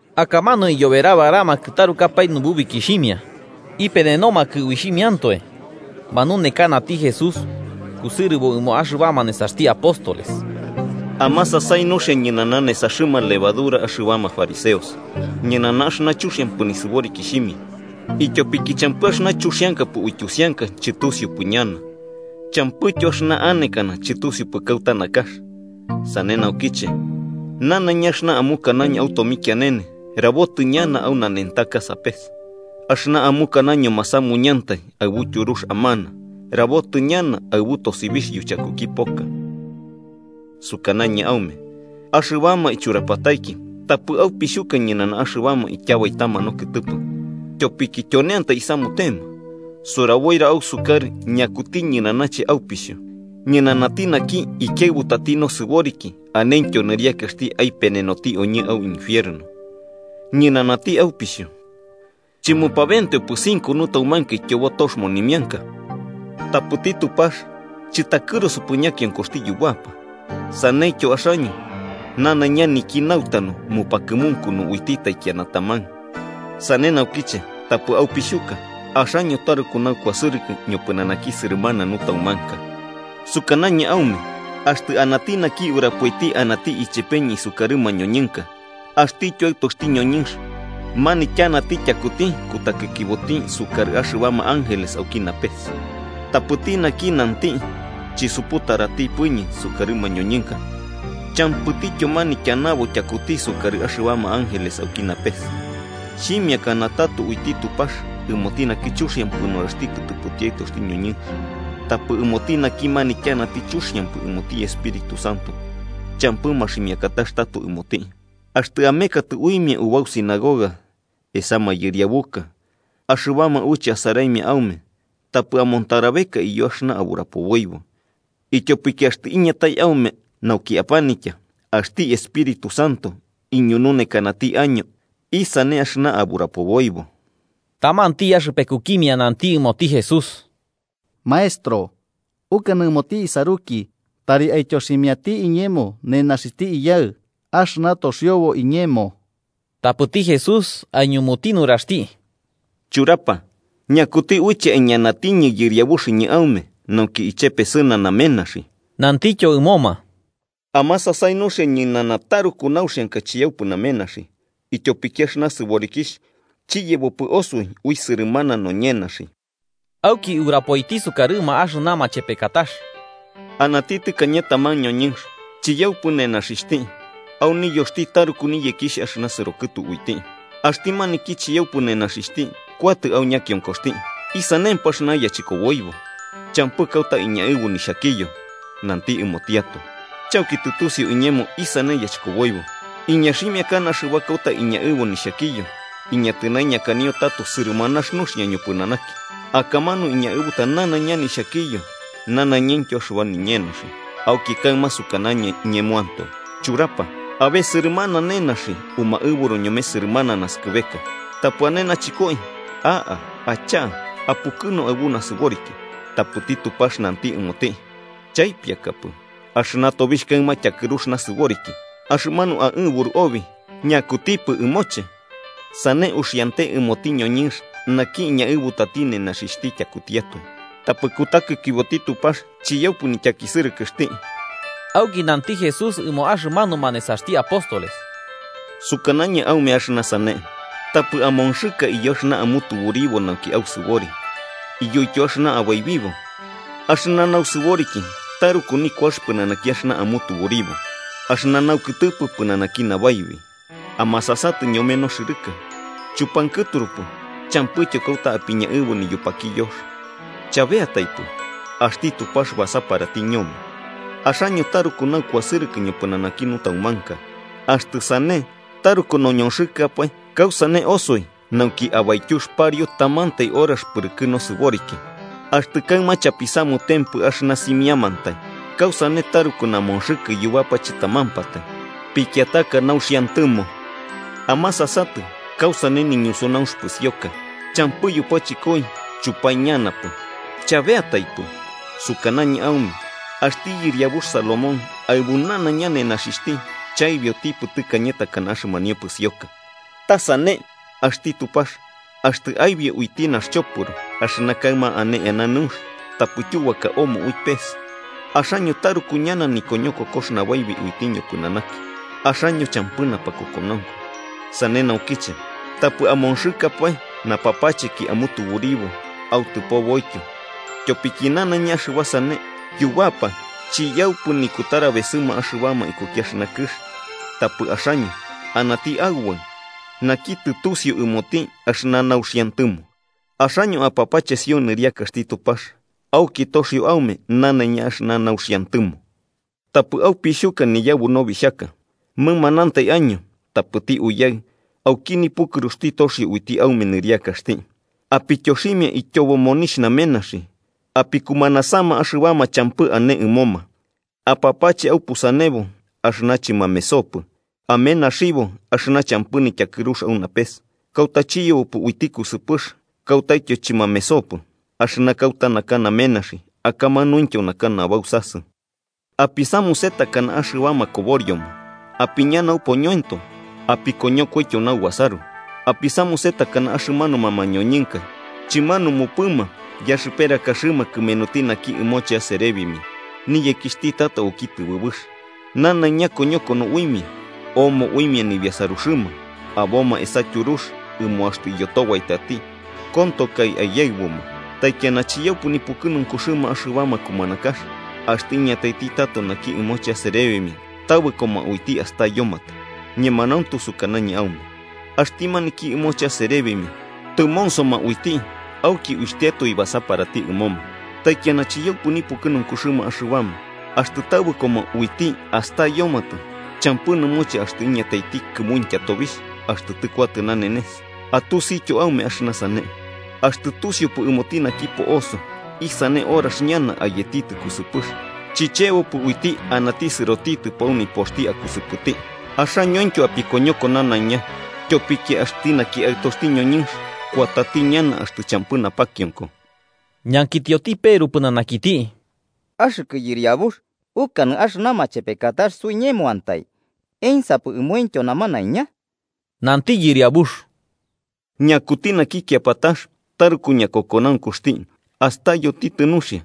Akamanu iyoberabaramakɨ tarukapae nububikixhimia, ipenenomakɨ uixhimiantoe. Manunekanati Jesús, kusɨrɨbo ɨmo axɨbama nesaxti apóstoles: “Amasasai nuxia ñɨnana nesaxɨma levadura axɨbama fariseos, ñɨnana axɨna chuxiampɨ nisɨborikixhimia, ityopiki champɨ axɨna chuxiankapɨ uityusianka chɨtusiupɨ ñana, champɨityo axɨna anekana chɨtusiupɨ kauta nakax. Sane naukiche, nanaiña axɨna amukanaño au tomikianene, rabotɨ ñana au nanentaka sapes. Axɨna amukanaño masamuñantai aɨbu tyurux amana, rabotɨ ñana aɨbu tosibixh yuchakuki poka. “Sukanañɨ aume, axɨbama ichurapataiki, tapɨ aupixhuka ñɨnana axɨbama ityabaitama nokɨtɨpɨ, tyopiki tyoneantai isamutema. Suraboira ausukarɨ ñakuti ñɨnanache aupixhu: ñɨnanati naki, ikiaɨbutati nosɨboriki, anentyo nɨriakaxti aipenenoti oñɨ au infierno. Ñɨnanati aupixhu. “¿Chɨmupabenteopɨ cinco nutaumanka ityobo tox monimianka? Tapɨti Tupax, chɨtakɨrusupɨ ñakionkoxti yubapa. Saneityo axaño, nanaiña niki nautanu mupakɨmunkunu uiti taikiana taman. Sane naukiche tapɨ aupixhuka: axaño taruku naukuasɨrɨkɨ ñopɨnanaki sɨrɨmana nutaumanka. “Sukanañɨ aume axtɨ anati naki urapoiti anati ichepeñɨ isukarɨ mañoñɨnka, axtityo Aɨtoxti ñoñɨnx manityanati tyakuti kutakikiboti sukarɨ axɨbama ángeles auki napes. Tapɨti naki nanti chisuputaratipɨñɨ sukarɨ mañoñɨnka, champɨtityo manityanabo tyakuti sukarɨ axɨbama ángeles auki napes. “Xhimiakana tato uiti Tupax ɨmoti naki chuxiampɨ nuraxti kɨtɨpɨti Aɨtoxti ñoñɨnx. Tapɨ ɨmoti naki manityanati chuxiampɨ ɨmoti Espíritu Santo champɨ maximiakatax tato ɨmoti. “Axtɨ emekatɨ uimia ubau sinagoga, esa mayɨriabuka, axɨbama uiche asaraimia aume, tapɨ amontarabeka iyo axɨna aburapoboibo, ityopiki axtɨ iñatai aume nauki apanitya, axti Espíritu Santo iñununekanati año isane axɨna aburapoboibo.” Tamanti axɨpekukimia nanti ɨmoti Jesús: –Maestro, ukanɨ ɨmoti isaruki tari aityoximiati iñemo nenaxixhti iyaɨ axɨna toxiobo iñemo. Tapɨti Jesús aiñumuti nuraxti: –Churapa, ¿ñakuti uiche aiñanatiñɨ yɨriabuxɨñɨ aume nauki ichepesɨna namenaxi? Nantityo ɨmoma: –Amasasai nuxia ñɨnana taruku nauxianka chiyaupɨ namenaxi. Ityopiki axɨna sɨborikixh chiyebopɨ osoi ui sɨrɨmana noñenaxi. Auki urapoiti sukarɨma axɨna machepekatax: “Anati tɨkañe taman ñoñɨnx chiyaupɨ nenaxixhti, au niyoxti taruku niyekixh axɨna sɨrokɨtu uiti. Axti maniki chiyaupɨ nenaxixhti kuatɨ au ñakionkoxti: ‘¿Isanempɨ axɨna yachɨkoboibo? Champɨ kauta iñaɨbu nixhakiyo.’ Nanti ɨmotiatoe: ‘Chauki tɨtusiu iñemo isane yachɨkoboibo. Iñaximiakana axɨba kauta iñaɨbu nixhakiyo iñatɨnaiñakanio tato sɨrɨmanax nuxia mopɨnanaki, akamanu iñaɨbuta nanaiña nixhakiyo nanaiñaintyo axɨba niñenaxi. Auki kaɨma sukanañɨ ñemoantoe: Churapa, abe sɨrɨmana nenaxi umaɨburu ñome sɨrɨmana naskɨbeka. Tapɨ ane nachɨkoi, a'a, acha'a, apukɨnu aɨbu nasɨboriki.’ Tapɨti Tupax nanti ɨmoti: ‘Chaipiakapɨ, axɨna tobixh kaɨma tyakɨrux nasɨboriki, axɨmanu aɨburu obi, ¿ñakutipɨ ɨmoche?’ Sane uxiante ɨmoti ñoñɨnx naki iñaɨbutati nenaxixhti tyakutiatoe, tapɨ kutakikiboti Tupax chiyaupɨ nityakisɨrɨkɨxti.” Auki nanti Jesús ɨmo axɨmanuma nesaxti apóstoles: “Sukanañɨ aume axɨna sane: Tapɨ amonxɨka iyo axɨna amutuburibo nauki ausɨbori, iyoityo axɨna abaibibo. Axɨna nausɨboriki taruku nikuax pɨnanaki axɨna amutuburibo, axɨna naukɨtɨpɨ pɨnanaki nabaibi. Amasasatɨ ñome noxɨrɨka: chupankɨturupɨ, champɨityo kauta apiñaɨbu niyupakiyox. Chabeataipɨ, axti Tupax basaparati ñome. ¡Axaño taruku naukuasɨrɨkɨ ñopɨnanaki nutaumanka! Axtɨ sane, taruku noñonxɨkapae, ¿kausane osoi nauki abaityux pariu tamantai horax pɨrɨkɨ nosɨboriki? Axtɨ kaɨma chapisamutempɨ axɨna simiamantai, ¿kausane taruku namonxɨkɨ yubapa chɨtamampatai pikiataka nauxiantɨmo? “Amasasatɨ kausane niñusunaunx pɨsioka: champɨ yupachɨkoi chupaiñanapɨ. Chabeataipɨ, sukanañɨ aume axti yɨriabux Salomón, aɨbu nanaiña nenaxixhti, chaibiotipɨ tɨkañe takana axɨmanio pɨsioka. Ta sane axti Tupax axtɨ aibio uiti naxchopɨro, axɨna kaɨma ane eana nɨunx tapɨ tyubaka omo ui pes, ¡axaño taruku ñana nikoñokokox nabaibi uiti ñopɨnanaki, axaño champɨ napakokonaunku! Sane naukiche, tapɨ amonxɨkapae, napapacheki amutuburibo autɨpoboityo. Tyopiki nanaiña axɨba sane yubapa chiyaupɨ nikutarabesɨma axɨbama ikuki axɨna kɨx, tapɨ axaño anati Aubaɨ naki tɨtusiu ɨmoti axɨna nauxiantɨmo. Axaño apapachesio nɨriakaxti Tupax, auki toxio aume nanaiña axɨna nauxiantɨmo. “Tapɨ aupixhuka, niyabu nobixhaka. Mɨmanantai año, tapɨti Uyaɨ, auki nipukɨruxti, toxio uiti aume nɨriakaxti. Apityoximia ityobo monixh namenaxi, apikumanasama axɨbama champɨ ane ɨmoma. Apapache aupusanebo axɨna chɨmamesopɨ, amenaxibo axɨna champɨ nityakɨrux au napes, kauta chiyebopɨ uiti kusɨpɨx kautaityo chɨmamesopɨ. Axɨna kauta naka namenaxi, akamanuintyo naka nabausasɨ. “Apisamuse takana axɨbama koborioma apiña naupoñoento apiñonokoityo naubasaru. Apisamuse takana axɨmanuma mañoñɨnka chɨmanumupɨma yaxɨperakaxɨma kɨmenuti naki ɨmoche aserebimia niyekixhti tato auki tɨbɨbɨx, nanaiña koñokono uimia omo uimia nibiasaruxɨma, aboma esa tyurux ɨmo axtɨ iyotobaitati kontokai aiyaɨbuma. Taikiana chiyaupɨ nipukɨnunkuxɨma axɨbama kumanakax axtɨ iñataiti tato naki ɨmoche aserebimia, tabɨkoma uiti astayomatɨ. Ñemanauntu sukanañɨ aume axti maniki ɨmoche aserebimia tɨmonsoma uiti auki uixhtiatoe basaparati ɨmoma. Taikiana chiyaupɨ nipukɨnunkuxɨma axɨbama, axtɨ tabɨkoma uiti astayomatɨ champɨ nɨmoche axtɨ iñataiti kɨmuintya tobixh axtɨ tɨkuatɨ nanenes. Atusityo aume axɨna sane: axtɨ tusiupɨ ɨmoti naki po'oso isane horax ñana ayetitɨ kusɨpɨx, chichebopɨ uiti anati sɨrotitɨpo au nipoxti akusɨpɨti. Axañointyo apikoñoko nanaiña. Tyopiki axti naki Aɨtoxti ñoñɨnx kuatati ñana axtɨ champɨ napakionko.” Ñankitioti Peru pɨnanakiti: –Axɨkɨ Yɨriabux, ¿ukanɨ axɨna machepekatax suiñemoantai, ensapɨ ɨmointyo namanaiña? Nanti Yɨriabux: “¿Ñakuti naki kiapatax taruku ñakokonaunkuxti astayotitɨ nuxia,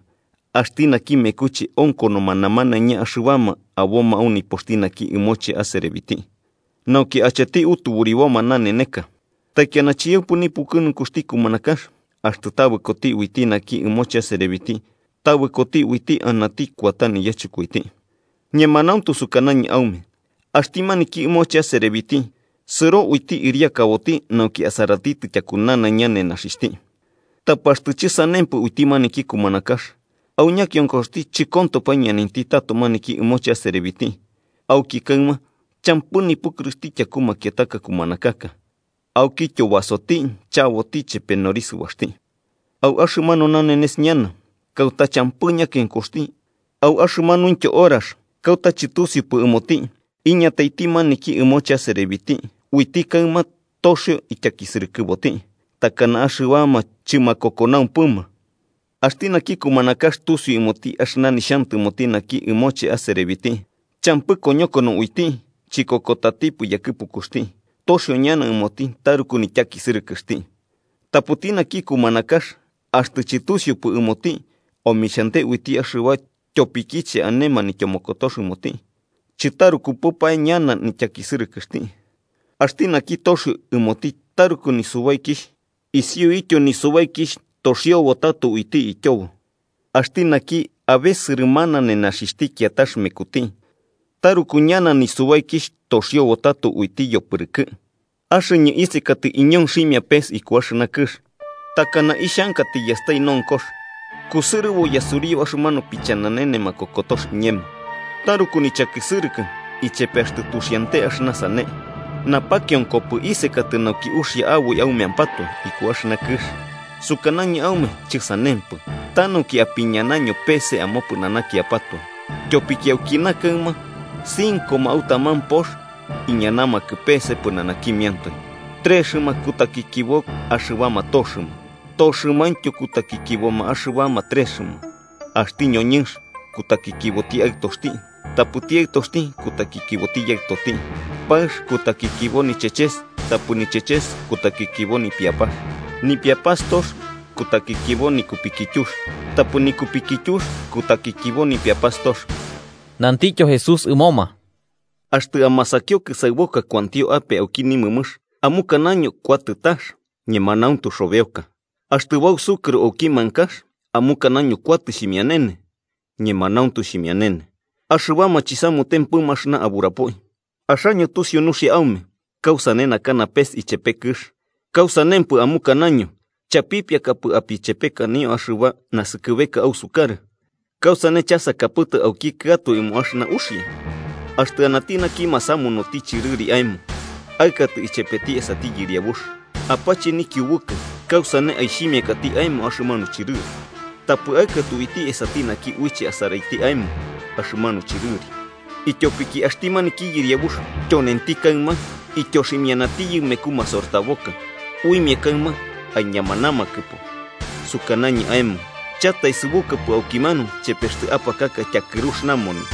axti naki mekuche onkonoma namanaiña axɨbama aboma au nipoxti naki ɨmoche aserebiti, nauki acheti utuburiboma naneneka? Taikiana chiyaupɨ nipukɨnunkuxti kumanakax axtɨ tabɨkoti uiti naki ɨmoche aserebiti tabɨkoti uiti anati kuata niyachɨkoiti. Ñemanauntu sukanañɨ aume axti maniki ɨmoche aserebiti sɨro uiti ɨriakaboti nauki asaratitɨ tyaku nanaiña nenaxixhti. Tapɨ axtɨ chɨsanempɨ uiti maniki kumanakax, au ñakionkoxti chɨkontopɨ aiñanainti tato maniki ɨmoche aserebiti, auki kaɨma champɨ nipukɨruxti tyaku makiataka kumanakaka, aukityo basoti, chaboti chepe norisɨbaxti, au axɨmanu nanenes ñana kauta champɨ ñakionkoxti au axɨmanuintyo horax kauta chɨtusiupɨ ɨmoti, iñataiti maniki ɨmoche aserebiti uiti kaɨma toxio ityakisɨrɨkɨboti, takana axɨbama chɨmakokonaumpɨma. “Axti naki kumanakax tusiu ɨmoti axɨna nixhantɨmoti naki ɨmoche aserebiti, champɨ koñokono uiti chikokotatipɨ yakɨpukuxti, toxio ñana ɨmoti taruku nityakisɨrɨkɨxti. Tapɨti naki kumanakax axtɨ chɨtusiupɨ ɨmoti omixhante uiti axɨba tyopikiche ane manityomokotox ɨmoti, chɨtarukupɨpae ñana nityakisɨrɨkɨxti. Axti naki toxio ɨmoti taruku nisubaikixh, isiuityo nisubaikixh toxiobo tato uiti ityobo. Axti naki abe sɨrɨmana nenaxixhti kiatax mekuti, taruku ñana nisubaikixh toxiobo tato uiti yopɨrɨkɨ. “Axɨñɨ isekatɨ iñonximia pes iku axɨna kɨx. ¡Takana ixhanka tiyastai nonkox! Kusɨrɨbo yasuriu axɨmanu pichananene makokotox iñemo, ¡taruku nichakisɨrɨkɨ ichepe axtɨ tuxiante axɨna sane! ¿Napakionkopɨ isekatɨ nauki uxia aboi aumeampatoe iku axɨna kɨx? Sukanañɨ aume chɨsanempɨ, ta nauki apiñanaño pese amopɨnanakiapatoe. Tyopiki aukina kaɨma, cincoma au taman pox iñanamakɨ pese pɨnanakimiantoe, trexɨma kutakikibo axɨbama toxɨma toxɨmaintyo kutakikiboma axɨbama trexma. Axti ñoñɨnx kutakikiboti aɨtoxti tapɨti aɨtoxti kutakikiboti yaɨtoti. Paɨx kutakikibo nicheches tapɨ nicheches kutakikibo nipiapax. Nipiapastox kutakikibo nikupikityux tapɨ nikupikityux kutakikibo nipiapastox.” Nantityo Jesús ɨmoma: “Axtɨ amasakio kɨsaɨboka kuantio ape auki nimɨmɨx, amukanaño kuatɨ tax, ñemanauntu xobeoka. Axtɨ bausukɨro auki mankax, amukanaño kuatɨ xhimianene, ñemanauntu xhimianene. ¡Axɨbama chapisamutempɨ axɨna aburapoi! Axaño tusiu nuxia aume kausane naka napes ichepe kɨx, ¿kausanempɨ amukanaño chapipiakapɨ apichepekanio axɨba naskɨbeka ausukarɨ? “¿Kausane chasakapɨtɨ aukikɨatoe ɨmo axɨna uxia? Axtɨ anati naki masamunuti chɨrɨri aemo aɨkatɨ ichepeti esati yɨriabux, apache nikiubukɨ kausane aixhimiakati aemo axɨmanu chɨrɨri, tapɨ aɨkatɨ uiti esati naki uiche asaraiti aemo axɨmanu chɨrɨri. Ityopiki axti maniki yɨriabux, tyonenti kaɨma, ityoximianatiyɨ meku masortaboka, uimia kaɨma iñamanamakɨpo. Sukanañɨ aemo chataesɨbukapɨ aukimanu chepe axtɨ apakaka tyakɨrux namoni.”